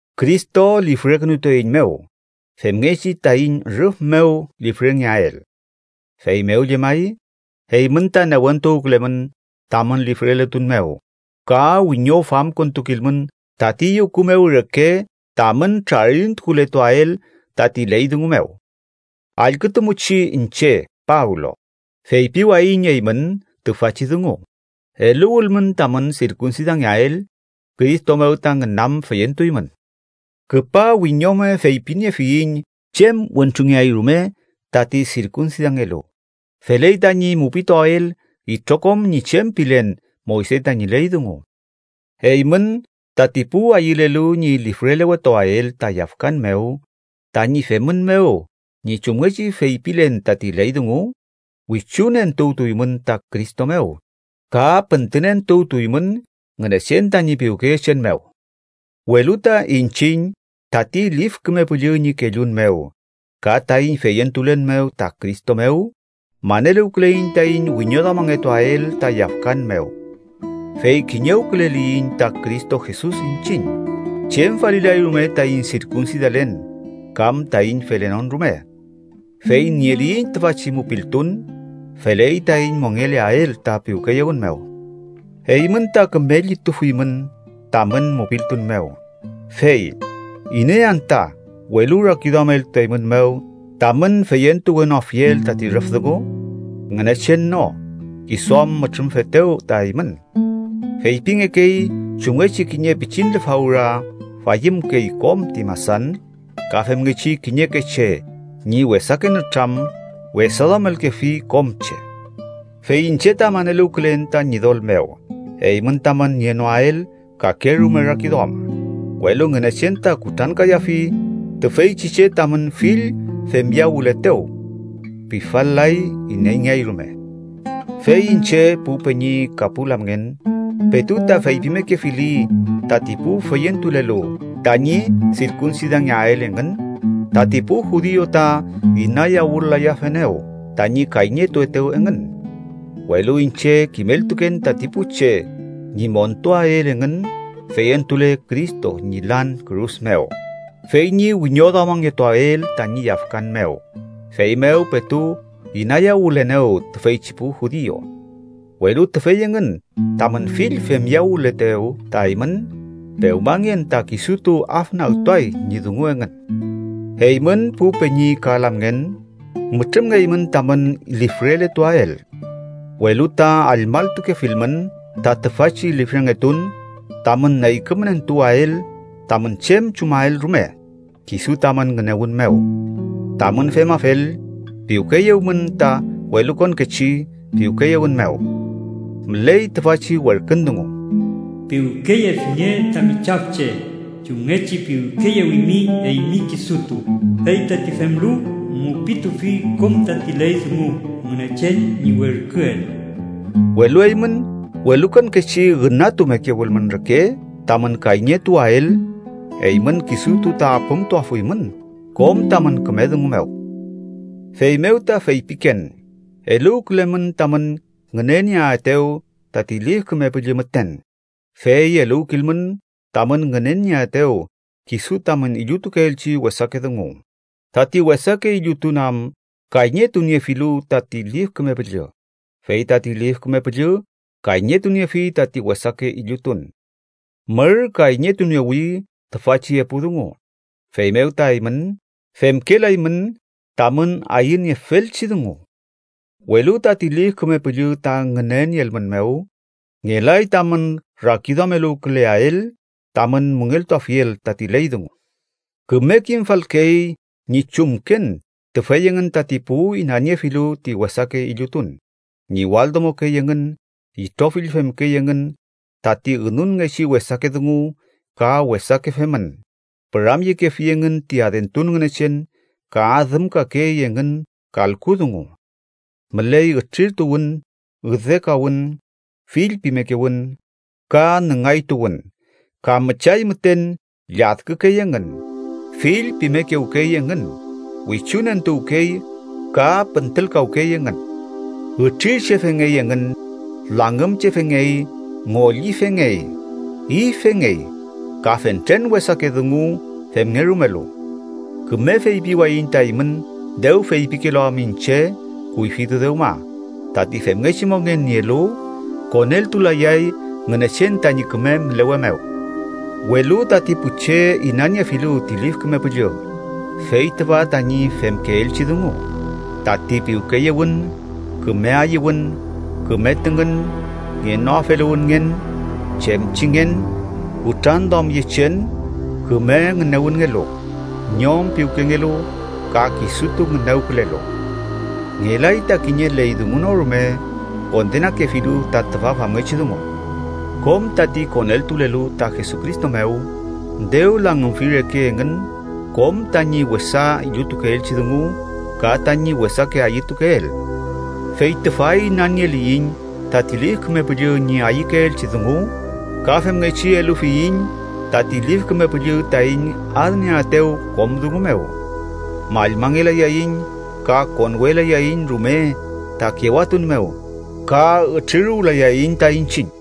Cristo lifrekünutueiñmew femngechi taiñ rüf mew lifrengeael. Feymew llemay, eymün ta newentuwkülemün tamün lifreletun mew ka wiñofamkontukilmün tati yuku mew reke tamün trarintukuletuael tati ley dungu mew. Allkütumuchi. Iñche, Pablo, feypiwayiñ eymün tüfachi dungu: eluwülmün tamün sirkunsidangeael, Cristo mew ta ngünam feyentuymün. Küpa wiñome feypiniewfiyiñ chem wentrungeay rume tati sirkunsidangelu, feley tañi mupituael itrokom ñi chem pilen Moyse tañi ley dungu. Eymün, tati pu ayülelu ñi lifrelewetuael ta yafkan mew tañi femün mew ñi chumngechi feypilen tati ley dungu, wichunentuwtuymün ta Cristo mew ka püntünentuwtuymün Ngünechen tañi piwkeyechen mew. Welu ta iñchiñ tati Lif Küme Püllü ñi kellun mew ka taiñ feyentulen mew ta Cristo mew, maneluwküleiñ taiñ wiñoduamangetuael ta yafkan mew. Fey kiñewküleliyiñ ta Cristo Jesus iñchiñ, chem falilay rume taiñ sirkunsidalen kam taiñ felenon rume. Fey nieliyiñ tüfachi mupiltun, feley taiñ mongeleael ta piwkeyewün mew. Eymün ta küme llitufuymün tamün mupiltun mew, fey ¿iney anta welurakiduameltueymünmew tamün feyentuwenoafiel tati rüf dungu? Ngünechen no, kisu am mütrümfetew ta eymün. Feypingekey chumngechi kiñe pichin lefawra fayümkey kom ti masan, ka femngechi kiñeke che ñi wesake nütram wesaduamelkefi kom che. Fey iñche ta maneluwkülen ta Ñidol mew eymün tamün nienoael kakerume rakiduam, welu Ngünechen ta kutrankayafi tüfeychi che tamün fill femyawületew. Pifal-lay ineyngeay rume. Fey iñche, pu peñi ka pu lamngen, petu ta feypimekefili tati pu feyentulelu tañi sirkunsidangeael engün, tati pu judiu ta inayawülayafenew tañi kayñetuetew engün. Welu iñche kimeltuken tati pu che ñi montuael engün feyentule Cristo ñi lan kürus mew, fey ñi wiñoduamangetuael tañi yafkan mew, feymew petu inayawülenew tüfeychi pu judiu. Welu tüfey engün tamün fill femyawületew ta eymün, ¡pewmangen ta kisutu afnagtuay ñi dungu engün! Eymün, pu peñi ka lamngen, mütrümngeymün tamün lifreletuael. Welu ta allmalltukefilmün ta tüfachi lifrengetun tamün neykümentuwael tamün chem chumael rume, kisu tamün ngünewün mew. Tamün femafel, piwkeyewmün ta welukonkechi piwkeyewün mew. Müley tüfachi werkün dungu: “Piwkeyefinge tami chafche chumngechi piwkeyewimi eymi kisutu, fey tati femlu mupitufi kom tati ley dungu Ngünechen ñi werküel.” Welu eymün welukonkechi ünatumekewülmün reke tamün kayñetuwael, eymün kisutu ta apümtuafuymün kom tamün küme dungu mew. Feymew ta feypiken: eluwkülemün tamün ngünenieaetew tati Lif Küme Püllü müten, fey eluwkilmün tamün ngüneaetew kisu tamün illutukeelchi wesake dungu, tati wesake illutun am kayñetuniefilu tati Lif Küme Püllü, fey tati Lif Küme Püllü kayñetuniefi tati wesake illutun. Mür kayñetuniewi tüfachi epu dungu, feymew ta eymün femkelaymün tamün ayüniefelchi dungu. Welu tati Lif Küme Püllü ta ngünenieelmünmew, ngelay tamün rakiduameluwküleael tamün müngeltuafiel tati ley dungu. Küme kimfalkey ñi chumken tüfey engün tati pu inaniefilu ti wesake illutun: ñiwaldomokey engün, itrofill femkey engün tati ünunngechi wesake dungu ka wesake femün, püramyekefi engün ti adentun ngünechen, ka adümkakey engün kalku dungu. Müley ütrirtuwün, üdekawün, fillpimekewün ka nüngaytuwün. Ka müchay müten lladkükey engün, fillpimekewkey engün, wichunentuwkey ka püntülkawkey engün. Ütrirchefengey engün, langümchefengey, ngollifengey, ifengey, ka fentren wesake dungu femngerumelu. Küme feypiwayiñ ta eymün, dew feypikelu am iñche kuyfitu dewma, tati femngechi mongen nielu, koneltulayay Ngünechen tañi küme mülewe mew. Welu tati pu che inaniefilu ti Lif Küme Püllü, fey tüfa tañi femkeelchi dungu: tati piwkeyewün, küme ayüwün, küme tüngün, ngenoafeluwünngen, chemchingen, kutranduamyechen, küme ngünewünngelu, ñom piwkengelu ka kisutu ngünewkülelu. Ngelay ta kiñe ley dungu no rume kondenakefilu ta tüfa famngechi dungu. Kom tati koneltulelu ta Jesucristo mew, dew langümfi reke engün kom tañi wesa illutukeelchi dungu ka tañi wesake ayütukeel. Fey tüfa inanieliyiñ tati Lif Küme Püllü ñi ayükeelchi dungu, ka femngechi elufiyiñ tati Lif Küme Püllü taiñ adnieaetew kom dungu mew. Mallmangelayaiñ, ka konwelayaiñ rume ta kewatun mew ka ütriruwlayayiñ ta iñchiñ.